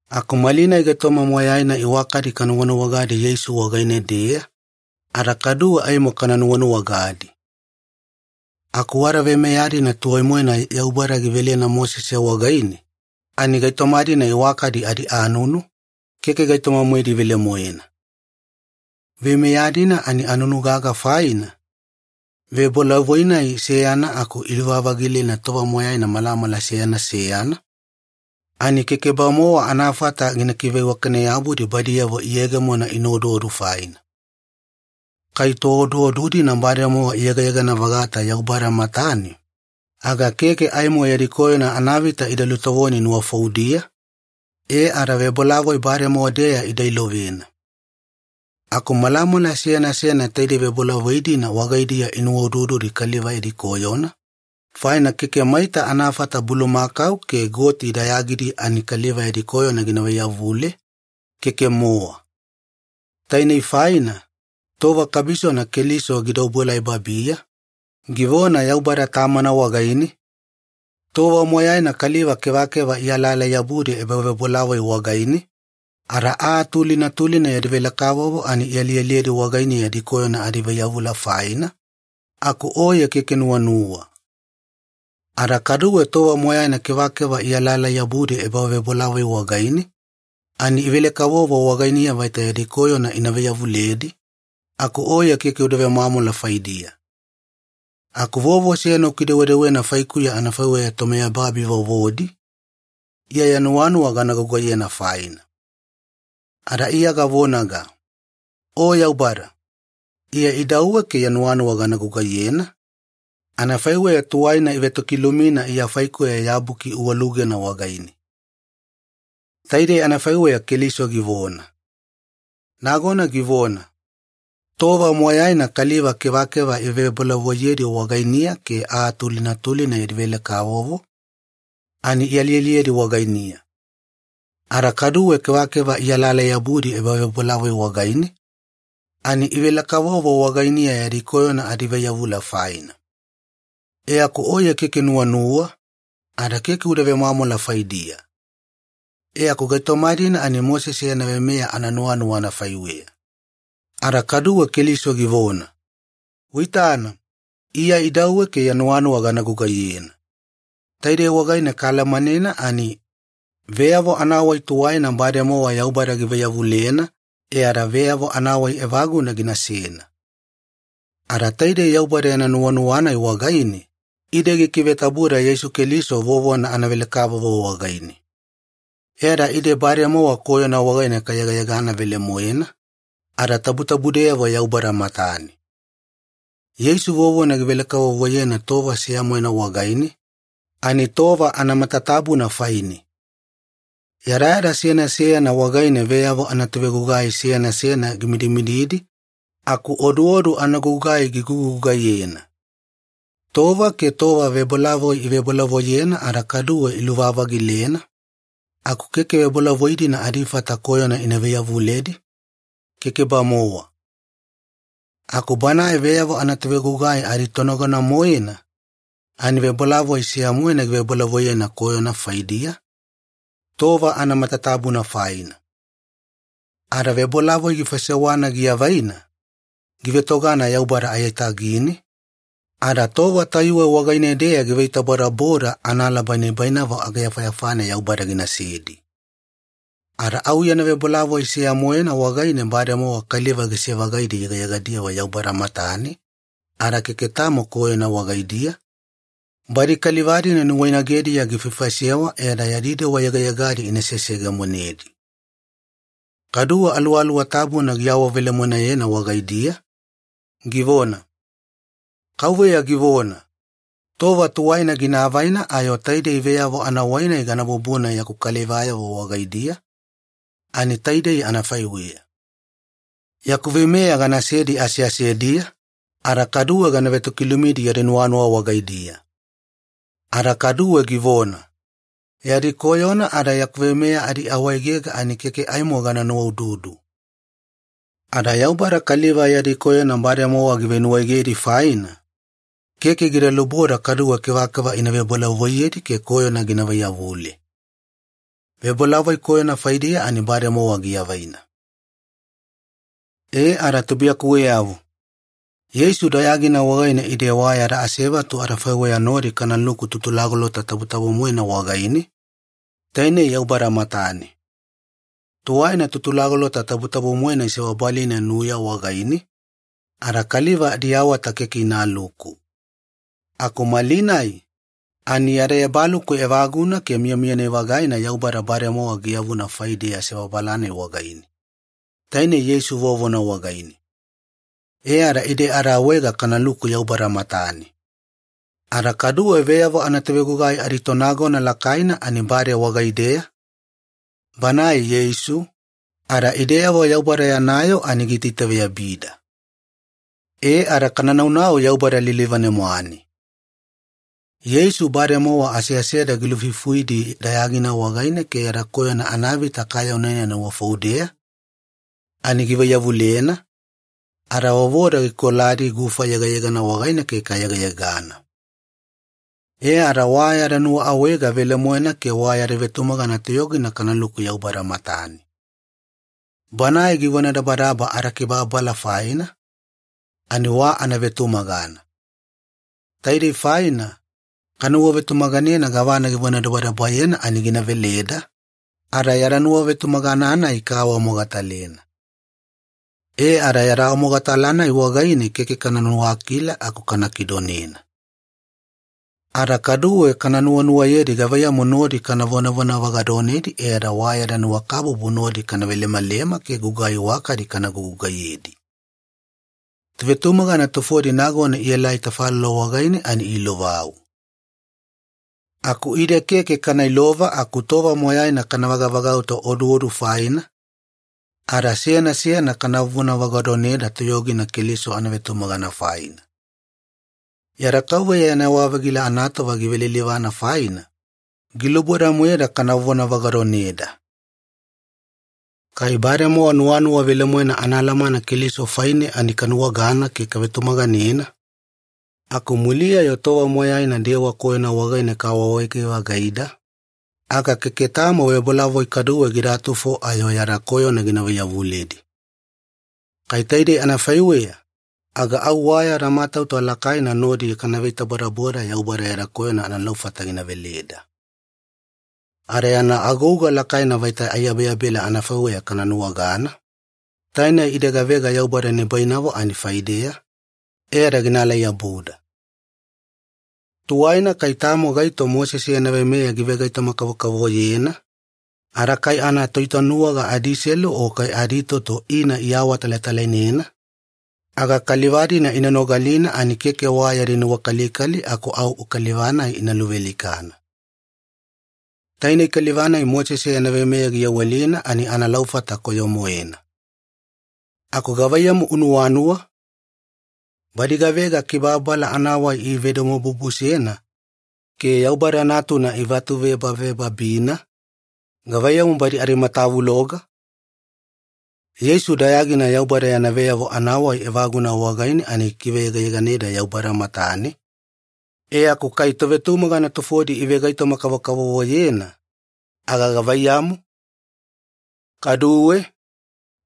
Aku malinai gaitoma moyaina iwakadi kanuwanuwagadi Yeisu wagaine-deya, ada kaduwe aimo kana nuwanuwagadi. Aku wada veimeya-dina tuwai-moena Yaubada giveleda Mosese wagaine, ani gaitoma-dina iwakadi adianunu, keke gaitoma-moedi velemoena. Veimeya-dina ani anunu gaga faina, vebolavoi-nai seyana aku iluvavagilena tova moyaina malamala seyana seyana, ani keke-bamowa anafata gina kiveiwakane-yabudi badiyavo iyegeyegemo ina oduodu faina. Kai tooduodu-dina bademowa ida yegayegana-vagata Yaubada matane, aga keke aimo yadi koyona anavita ida lutovoni nuwafoudiya, e ada vebolavoi bademowa-deya ida ilovena. Aku malamala seyana seyana taidei vebolavoi-dina wagaidiya inuwaudududi kaliva yadi koyona, faina keke maita anafata bulumakau ke goti dayagidi ani kaliva yadi koyona gina vaiyavule, keke-mowa. Tainei faina, tova kabisona Keliso gida obuelai babiya, givona Yaubada Tamana wagaine, “Tova moyaina kaliva kevakeva ialaalai-yabudi ebavebolavoi wagaine, ada aa tulina tulina yadi velekavovo ani ialialiyedi wagainiya yadi koyona adivaiyavula faina, aku Oye keke nuwanuwa. Ada kaduwe tova moyaina kevakeva ialalai-yabudi ebavebolavoi wagaine, ani ivele-kavovo wagainiya vaita yadi koyona ina vaiyavuledi, aku Oye keke uda vemwamwala faidiya. Aku vovo seyana ukidewedewena faikuya anafaiweya tomiyababi vovodi, Iya ya nuwanuwa gana gugaiyena faina. Ada Iya gavonaga, ‘O Yaubada, Iya idauwe ke ya nuwanuwa gana gugaiyena, anafaiweya tuwaina ivetokilumina Iya faikuya ya buki uwalugena wagaine.’” Taidei anafaiweya Keliso givona. Nagona givona, “Tova moyaina kaliva kevakeva ivevebolavoiyedi wagainiya ke aa tulina tulina yadi velekavovo ani ialialiyedi wagainiya. Ada kaduwe kevakeva ialaalai-yabudi ebavebolavoi wagaine ani ivelekavovo wagainiya yadi koyona adivaiyavula faina. E aku Oye keke nuwanuwa, ada keke uda vemwamwala faidiya. E aku gaitoma-dina ani Mosese yana veimeya ananuwanuwa anafaiweya.” Ada kaduwe Keliso givona, “Uitana, Iya idauwe ke ya nuwanuwa gana gugaiyena.” Taidei wagaine kaalamanena ani, veyavo anawai tuwaina bademowa Yaubada givaiyavulena e ada veyavo anawai evaguna ginasena. Ada taidei Yaubada yana nuwanuwa-nai wagaine, ide gikivetabuda Yeisu Keliso vovona anavelekavovo wagaine. E ada ide bademowa koyona wagaine kayegayegana velemoena, ada tabutabudeyavo Yaubada matane. Yeisu vovona givelekavovoyena tova seya-moena wagaine, ani tova anamatatabuna faine. Yadayada seyana seyana wagaine veyavo anatovegugai seyana seyana gimidimididi aku oduodu anagugai gigugugaiyena. Tova ke tova vebolavoi ivebolavoiyena ada kaduwe iluvavagilena, aku keke vebolavoi-dina adifata koyona ina vaiyavuledi, keke-bamowa. Aku Banae veyavo anatovegugai aditonagona-moena, ani vebolavoi seya-moena givebolavoiyena koyona faidiya, tova anamatatabuna faina. Ada vebolavoi gifaisewana giavaina, givetogana Yaubada aiyatagine, ada tova tayuwe wagaine-deya giveitabodaboda analaba nibainavo ageyafayafane Yaubada ginasedi. Ada au yana vebolavoi seya-moena wagaine, bademowa kaliva gise-vagaidi yegayegadiyavo Yaubada matane ada keke tamo koyona wagaidiya, badi kaliva-dina nuwainagediya gifaifaisewa e ada yadi dewa yegayegadi ina seseyegemonedi. Kaduwe Aluwaluwa Tabuna giawavelemoenayena wagaideya, givona, “KAUVEYA givona, Tova tuwaina gina avaina ayo taidei veyavo anawai-nai gana bubuna yaku kalivayavo wagaidiya, ani taidei anafaiweya. Yaku veimeya ganasedi aseasediya, ada kaduwe gana vetokilumidi yadi nuwanuwa wagaidiya.” Ada kaduwe givona, “Yadi koyona ada yaku veimeya adiawaegega ani keke aimo gana nuwaududu.” Ada Yaubada kaliva yadi koyona bademowa givenuwaegedi faina, keke gida luboda kaduwe kevakeva ina vebolavoiyedi ke koyona gina vaiyavule. Vebolavoi koyona faidiya ani bademowa giavaina. E ada tubuiyakuweyavo, Yeisu dayagina wagaine ide wa yada asevatu adafaiweya nodi kanaluku Tutulagolota Tabutabu-moena wagaine, tainei Yaubada matane. Tuwaina Tutulagolota Tabutabu-moena isebabalina nuya wagaine, ada kaliva adiawata keke inaluku. Aku malinai, ani yada ebaluku evaguna ke miyamiyani-vagaina Yaubada bademowa giyavuna faideya sebabala-nai wagaine, tainei Yeisu vovona wagaine. E ada ide adaawaega kanaluku Yaubada matane. Ada kaduwe veyavo anatovegugai aditonagona lakaina ani bade wagaideya, Banae Yeisu, ada ideyavo Yaubada yana yoo ani giitaitaveyabida. E ada kana naunau Yaubada lilivane-mwane. Yeisu bademowa aseaseda gilufuifuidi dayagina wagaine ke yada koyona anavita kaayaunena nuwafoudeya ani givaiyavulena, ada vovoda gikoladi gufa yegayegana wagaine ke kayegayegana. E ada wa yada nuwaawaega velemoena ke wa yada vetumagana toyogina kanaluku Yaubada matane. Banae givonadabadaba adakibababala faina, ani wa anavetumagana. Taidei faina, kanuwavetumaganena gavana givonadabadabayena ani gina veleda, ada yada nuwavetumagana-nai kaawamogatalena. E ada yada awamogatala-nai wagaine keke kana nuwakila aku kana kidonena. Ada kaduwe kana nuwanuwayedi gavaiyamu nodi kana vonavona vagadoneda e ada wa yada nuwakabubu nodi kana velemalema ke gugai iwakadi kana gugugaiyedi. Tovetumagana tufodi nagona ielaelai tafalolo wagaine ani iilovau. Aku ide keke kana ilova aku tova moyaina kana vagavagauta oduodu faina, ada seyana seyana kana vonavona vagadoneda toyogina Keliso anavetumagana faina. Yada Kauveya yana yewa-vagila anatova givelilivana faina, giluboda-moeda kana vonavagadoneda. Kai bademowa nuwanuwa velemoena anaalamana Keliso faine ani kanuwagana ke kavetumaganena, aku muliya-yo tova moyaina dewa koyona wagaine kaawaawaege-vagaida, aga keke tamo vebolavoi kaduwe gida tufo ayo yada koyona gina vaiyavuledi. Kai taidei anafaiweya, aga au wa yada matauta lakaina nodi kana veitabodaboda Yaubada yada koyona analaufata gina veleda. Ada yana agouga lakaina vaita aiyabeyabela anafaiweya kana nuwagana, tainei ide gavega Yaubada nibainavo ani faideya, e ada ginaalai-yabuda. Tuwaina kai tamo gaito Mosese yana veimeya givegaitoma-kavokavovoyena, ada kai anatoitanuwaga adiselu o kai aditoto ina iawatalatalainena, aga kaliva-dina ina nogalina ani keke wa yadi nuwakalikali aku au kaliva-nai ina luvealikana. Tainei kaliva-nai Mosese yana veimeya giyawelina ani analaufata koyo-moena. Aku gavaiyamu unuwanuwa? Badi gavega kibababala anawai ivedomobubusena ke Yaubada Natuna ivatuvebavebabina, gavaiyamu badi adimatavuloga? Yeisu dayagina Yaubada yana veyavo anawai evaguna wagaine ani gikiveyegayeganeda Yaubada matane, e aku kai tovetumagana tufodi ivegaitoma-kavokavovoyena, aga gavaiyamu? Kaduwe,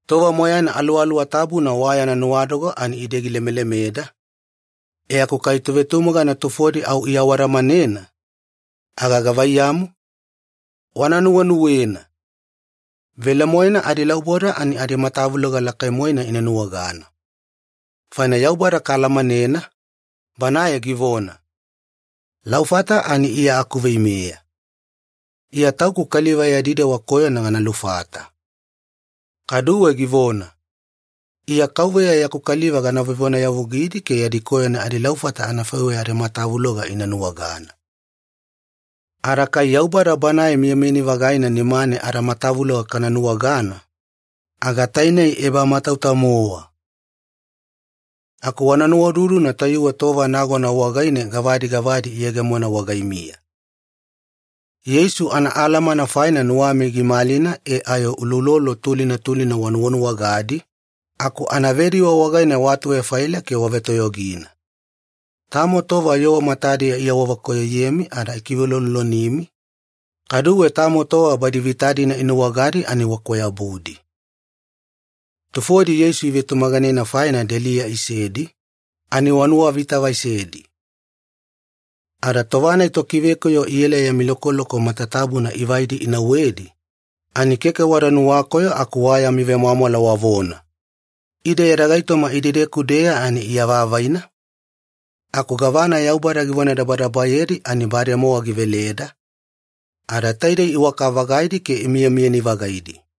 tova moyaina Aluwaluwa Tabuna wa yana nuwadoga ani ide gilemelemeda, e aku kai tovetumagana tufodi au iawadamanena, aga gavaiyamu? Wana nuwenuwena. Velemoena adilauboda ani adimatavuloga lakai-moena ina nuwagana. Faina Yaubada kaalamanena, Banae givona, “Laufata ani Iya akuveimeya. Iya Tauku kaliva yadi dewa koyona gana lufata.” Kaduwe givona, “Iya KAUVEYA yaku kaliva gana vevonayavugidi ke yadi koyona adilaufata anafaiweya adimatavuloga ina nuwagana.” Ada kai Yaubada Banae miyamiyani-vagaina nimane adamatavuloga kana nuwagana, aga tainei ebamatauta-mowa! Aku wana nuwaududuna tayuwe tova nagona wagaine gavadi gavadi iyegemona wagaimiya. Yeisu anaalamana faina nuwami gimalina e ayo uloulolo tulina tulina wanuwanuwagadi, aku anavediwe wagaine waatuvefaila ke wavetoyogina. Tamo tova yoo matadiya iawavekoyoyemi ada ikiveuloulolonimi, kaduwe tamo tova badi vita-dina inuwagadi ani wakwayabudi. Tufodi Yeisu ivetumaganena faina deliya isedi, ani wanuwavitavaisedi. Ada tova-nai tokivekoyo iela yami lokoloko matatabuna ivaidi inauwedi, ani keke wada nuwakoyo aku wa yami vemwamwala wavona, “Ide yada gaitoma idedeku-deya ani iavavaina, aku gavana Yaubada givonadabadabayedi ani bademowa giveleda, ada taidei iwaka-vagaidi ke imiyamiyani-vagaidi.”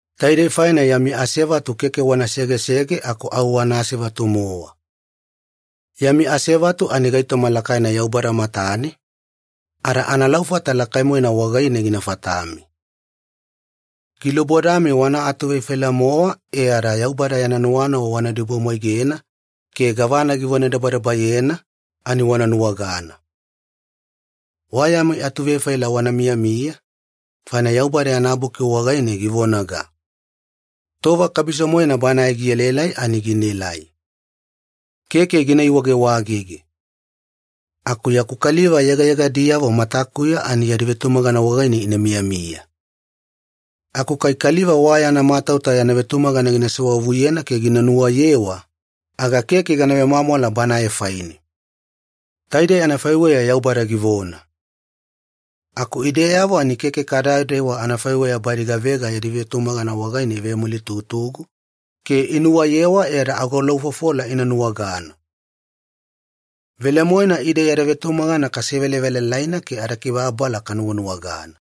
Taidei faina yami asevatu keke wana segesege aku au wana asevatu-mowa. Yami asevatu ani gaitoma lakaina Yaubada matane, ada analaufata lakai-moena wagaine gina fatami. Gilubodami wana atuvefaila-mowa e ada Yaubada yana nuwanuwa wana idibumwaigena, ke gavana givonadabadabayena ani wana nuwagana. Wa yami atuvefaila wana miyamiya, faina Yaubada yana Buki wagaine givonaga, “Tova kabiso-moena Banae gielaelai ani ginaelai. Keke gina iwagewagege. Aku yaku kaliva yegayegadiyavo matakuya ani yadi vetumagana wagaine ina miyamiya. Aku kai kaliva wa yana matauta yana vetumagana gina sewavuyena ke gina nuwayewa, aga keke gana vemwamwala banae faine.” Taidei anafaiweya Yaubada givona. Aku ideyavo ani keke kadadewa anafaiweya badi gavega yadi vetumagana wagaine ivemulitugutugu ke inuwayewa e ada agolaufofola ina nuwagana. Velemoena ide yada vetumagana kasevelavelalaina ke adakibababala kanuwanuwagana.